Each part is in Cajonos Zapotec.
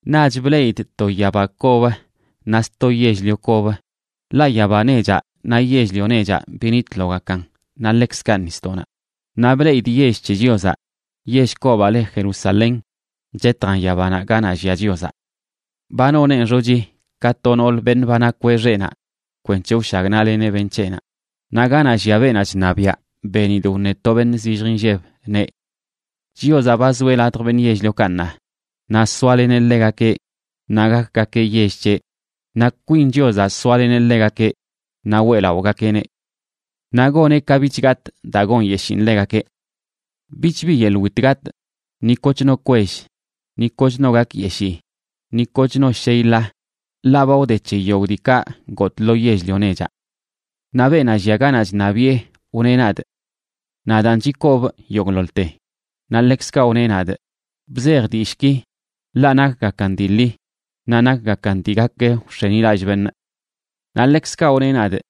Naꞌch bleꞌidꞌ to yaba kob naꞌ sto yell-lio kob, ḻaꞌ yaba nechaꞌ naꞌ yell-lio nechaꞌ binitlogakan naꞌ ḻekzkaꞌ nisdoꞌnaꞌ. Naꞌ bleꞌidꞌ yell c̱he Chiozaꞌ, yell kobaꞌ le Jerusalén chetjan yabanaꞌ ganaꞌ llia Chiozaꞌ. Ba noneꞌn xochi ka to noolə beṉꞌ ba nakweꞌ xeꞌnaꞌ kwenc̱he wshagnaꞌleneꞌ beṉꞌ c̱heꞌnaꞌ. Naꞌ ganaꞌ llia beenaꞌ chṉabiaꞌ, benidꞌ wṉe to beṉꞌ zillj inlleb, neꞌ: ―Chiozaꞌ ba zoeꞌ ladj beṉꞌ yell-liokaꞌ ṉaa. Naꞌ soaleneꞌ ḻegakeꞌ, naꞌ gakgakeꞌ yell c̱heꞌ, naꞌ kwin Chiozaꞌ soaleneꞌ ḻegakeꞌ naꞌ weꞌlaꞌogakeꞌneꞌ. Naꞌ goneꞌ ka bich gatꞌ daa gonyeshiin ḻegakeꞌ. Bich bi yeḻꞌ wit gatꞌ, ni kochno kwell, ni koch no gakyeshii, ni koch no shey ḻa, ḻaꞌ ba wde c̱he yogꞌ diikaꞌ gotꞌ lo yell-lio nechaꞌ. Naꞌ beenaꞌ llia ganaꞌ chṉabiꞌe wneꞌ nadꞌ: ―Nadaan chikobꞌ yogꞌḻoḻte. Naꞌ ḻekzkaꞌ wneꞌ nadꞌ: ―Bzej dillꞌki, ḻaꞌ nakgakan dii ḻi naꞌ nakgakan dii gak wx̱enilallꞌ beṉꞌ. Naꞌ ḻekzkaꞌ wneꞌ nadꞌ: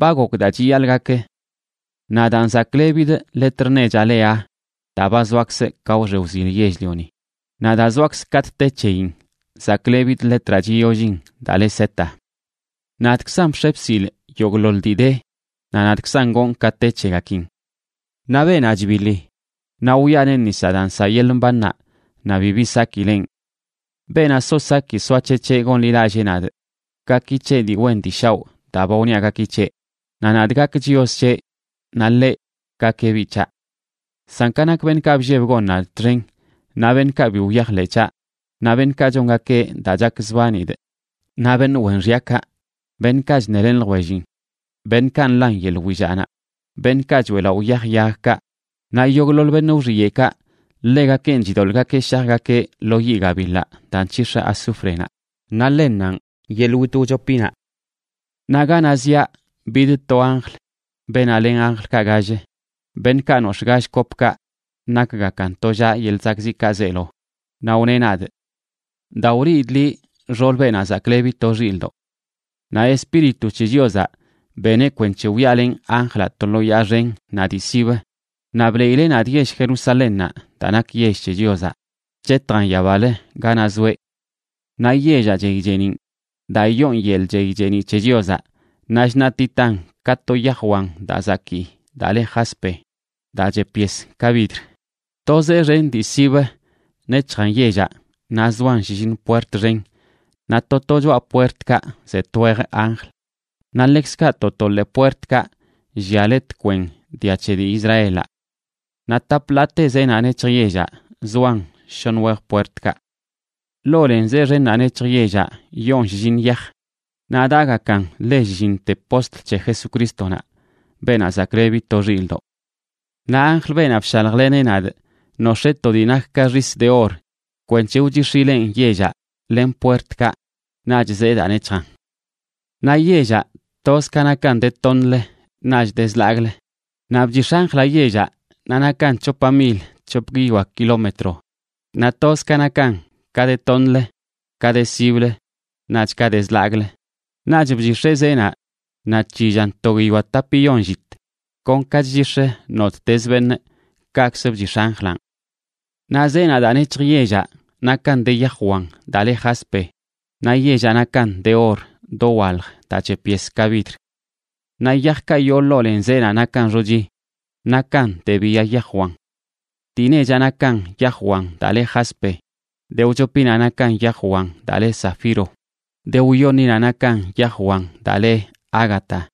―Ba gok daa chiyaḻꞌ gak. Nadaan zaklebidꞌ letr nechaꞌ le Aa daa ba zoakzꞌ ka wxe wzil yell-lioni, naꞌ daa zoakzꞌ katꞌ te c̱heyin zaklebidꞌ letraꞌ chiyollin daa le Z.b Nadꞌkzan bx̱e bsilꞌ yogꞌḻoḻ dii de, naꞌ nadꞌkzan gonꞌ ka te c̱hegakin. Naꞌ beenaꞌ chbiḻi, wiꞌaneꞌ nis daa nsaꞌ yeḻꞌ mbannaꞌ naꞌ bibi sakileꞌn. Beenaꞌ so saki soac̱hec̱heꞌ gonḻilallee nadꞌ, gaki c̱heꞌ dii wen dii shaoꞌ daa ba wniaꞌ gaki c̱heꞌ, naꞌ nadꞌ gak Chios c̱heꞌ naꞌ ḻeꞌ gakeꞌ biꞌ c̱haꞌ. San ka nak beṉꞌkaꞌ blleb gon nadꞌ txen, naꞌ beṉꞌkaꞌ bi wyajḻeꞌ c̱haꞌ, naꞌ beṉꞌkaꞌ chongakeꞌ daa chakzbanidꞌ, naꞌ beṉꞌ wen xyakaꞌ, beṉꞌkaꞌ chṉelen ljwellin, beṉꞌkaꞌ nḻan yeḻꞌ willaꞌnaꞌ, beṉꞌkaꞌ choeꞌlaꞌo yaj yagkaꞌ, naꞌ yogꞌḻoḻ beṉꞌ wxiyeꞌkaꞌ, ḻegakenꞌ chidoḻꞌgakeꞌ shajgakeꞌ lo yiꞌ gabiḻaꞌ daa nc̱hix̱ azúfrenaꞌ, naꞌ ḻennanꞌ yeḻꞌ wit wchopinaꞌ. Naꞌ ganaꞌ ziaꞌ bid to anjl beenaꞌ len anjlkaꞌ gall, beṉꞌkaꞌ nox̱ꞌ gall kopkaꞌ nakgakan tollaꞌ yeḻꞌ zakꞌziꞌkaꞌ zeelo, naꞌ wneꞌ nadꞌ: ―Da, wliidꞌ liꞌ xool Beenaꞌ Zaklebi to Xilꞌdoꞌ. Naꞌ Espíritu c̱he Chiozaꞌ beneꞌ kwenc̱he wyaalenꞌ anjlaꞌ to lo yaa xen naꞌ dii sibə, naꞌ bliileꞌ nadꞌ yell Jerusalénnaꞌ daa nak yell c̱he Chiozaꞌ, chetjan yabalə ganaꞌ zoeꞌ. Naꞌ yellaꞌ chey cheeniꞌn daa yoon yeḻꞌ chey cheeniꞌ c̱he Chiozaꞌ, naꞌ chṉaꞌtitan ka to yaj wan daa zakii daa le jaspe, daa chep yes ka vidr. To zee xen dii sibə nec̱hjan yellaꞌ naꞌ zoan shlliṉ puert xen, naꞌ to to choꞌa puertkaꞌ ze twej anjl. Naꞌ ḻekzkaꞌ to to ḻee puertkaꞌ llia le tkwen dia c̱he dii Israelaꞌ. Naꞌ tap ḻaate zeenaꞌ nec̱hj yellaꞌ zoan shoṉ wej puertkaꞌ. Ḻoo len zee xennaꞌ nec̱hj yellaꞌ yoon shlliṉ yaj, naꞌ daꞌgakan le shlliṉte postl c̱he Jesucrístonaꞌ, Beenaꞌ Zaklebi to Xilꞌdoꞌ. Naꞌ anjl, beenaꞌ bshaljleneꞌ nadꞌ, nox̱ee to dii nak ka xis de or kwenc̱he wchix̱ileꞌn yellaꞌ len puertkaꞌ naꞌch zee daa nec̱hjan. Naꞌ yellaꞌ toz ka nakan de toṉlə naꞌch de zlagꞌlə. Naꞌ bchix̱ anjlaꞌ yellaꞌ naꞌ nakan c̱hopa mil c̱hop guiyoa kilómetro, naꞌ toz ka nakan ka de toṉlə, ka de siblə, naꞌch ka de zlagꞌlə. Naꞌch bchix̱eꞌ zeenaꞌ naꞌ c̱hillan to guiyoa tapiyon llit.c Kon ka chchix̱ə nottezə beṉꞌ, kaꞌkzə bchix̱ anjlanꞌ. Naꞌ zeenaꞌ daa nec̱hj yellaꞌ nakan de yaj wan daa le jaspe, naꞌ yellaꞌ nakan de or dowalj daa chep yes ka vidr. Naꞌ yajkaꞌ yoo ḻoo len zeenaꞌ nakan xochi, nakan de biya yaj wan. Dii nechaꞌ nakan yaj wan daa le jaspe, de wchopinaꞌ nakan yaj wan daa le zafiro, de wyoṉinaꞌ nakan yaj wan daa le ágata,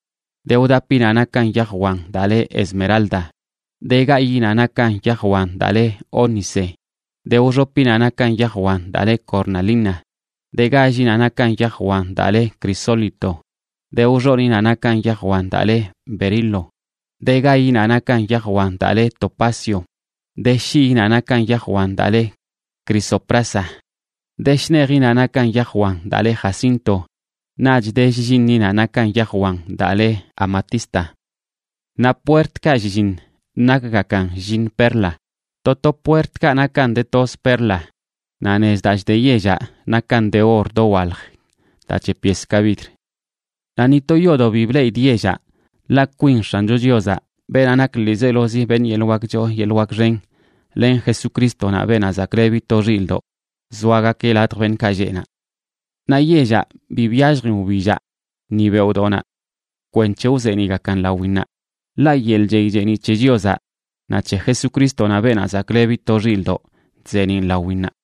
de wdapinaꞌ nakan yaj wan daa le esmeralda, de gayiꞌnaꞌ nakan yaj wan daa le ónice, de wxopinaꞌ nakan yaj wan daa le cornalina, de gállinaꞌ nakan yaj wan daa le crisólito, de wxoniꞌnaꞌ nakan yaj wan daa le berilo, de gayinaꞌ nakan yaj wan daa le topacio, de shiyinaꞌ nakan yaj wan daa le crisoprasa, de shnejinaꞌ nakan yaj wan daa le jacinto, naꞌch de shlliṉinaꞌ nakan yaj wan daa le amatista. Naꞌ puertkaꞌ shlliṉ nakgakan shlliṉ perla, to to puertkaꞌ nakan de toz perla. Naꞌ nez daa chde yellaꞌ nakan de or dowalj daa chep yes ka vidr. Naꞌ ni to yoodoꞌ bi bleꞌidꞌ yellaꞌ, ḻaꞌ kwin X̱ancho Chiozaꞌ, beenaꞌ nak ḻiizelozi beṉꞌ yeḻꞌ wak choo yeḻꞌ wak xen, len Jesucrístonaꞌ, Beenaꞌ Zaklebi to Xilꞌdoꞌ, zoagakeꞌ ladj beṉꞌkaꞌ lleꞌ naꞌ. Naꞌ yellaꞌ bi byalljin wbillaꞌ ni beoꞌdoꞌnaꞌ kwenc̱he wzeeniꞌgakan lawinnaꞌ, ḻaꞌ yeḻꞌ chey cheeniꞌ c̱he Chiozaꞌ naꞌ c̱he Jesucrístonaꞌ, Beenaꞌ Zaklebi to Xilꞌdoꞌ, chzeeniꞌn lawinnaꞌ.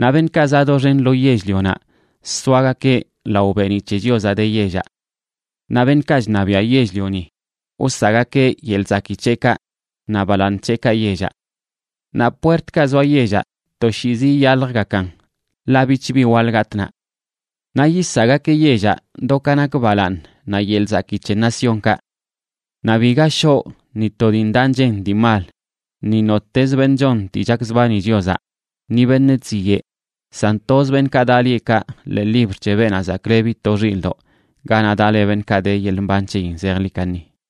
Naꞌ beṉꞌkaꞌ zaꞌ doxen lo yell-lionaꞌ soagakeꞌ lao beeniꞌ c̱he Chiozaꞌ de yellaꞌ. Naꞌ beṉꞌkaꞌ chṉabiaꞌ yell-lioni wsaꞌgakeꞌ yeḻꞌ zakii c̱heꞌkaꞌ naꞌ balaaṉ c̱heꞌkaꞌ yellaꞌ. Naꞌ puertkaꞌ zoa yellaꞌ toshiizi iyaljgakan, ḻaꞌ bichbi waḻ gatꞌ naꞌ. Naꞌ yisaꞌgakeꞌ yellaꞌ do ka nak balaaṉ naꞌ yeḻꞌ zakii c̱he naciónkaꞌ. Naꞌ biga shoꞌ ni to dii ndaꞌ nchen dii mal, ni nottez beṉꞌ chon dii chakzbani Chiozaꞌ, ni beṉꞌ chziyeꞌ, san toz beṉꞌkaꞌ daꞌ lieꞌkaꞌ ḻee libr c̱he Beenaꞌ Zaklebi to Xilꞌdoꞌ, ganaꞌ daꞌ le beṉꞌkaꞌ de yeḻꞌ mban c̱heyin zejḻi kaṉi.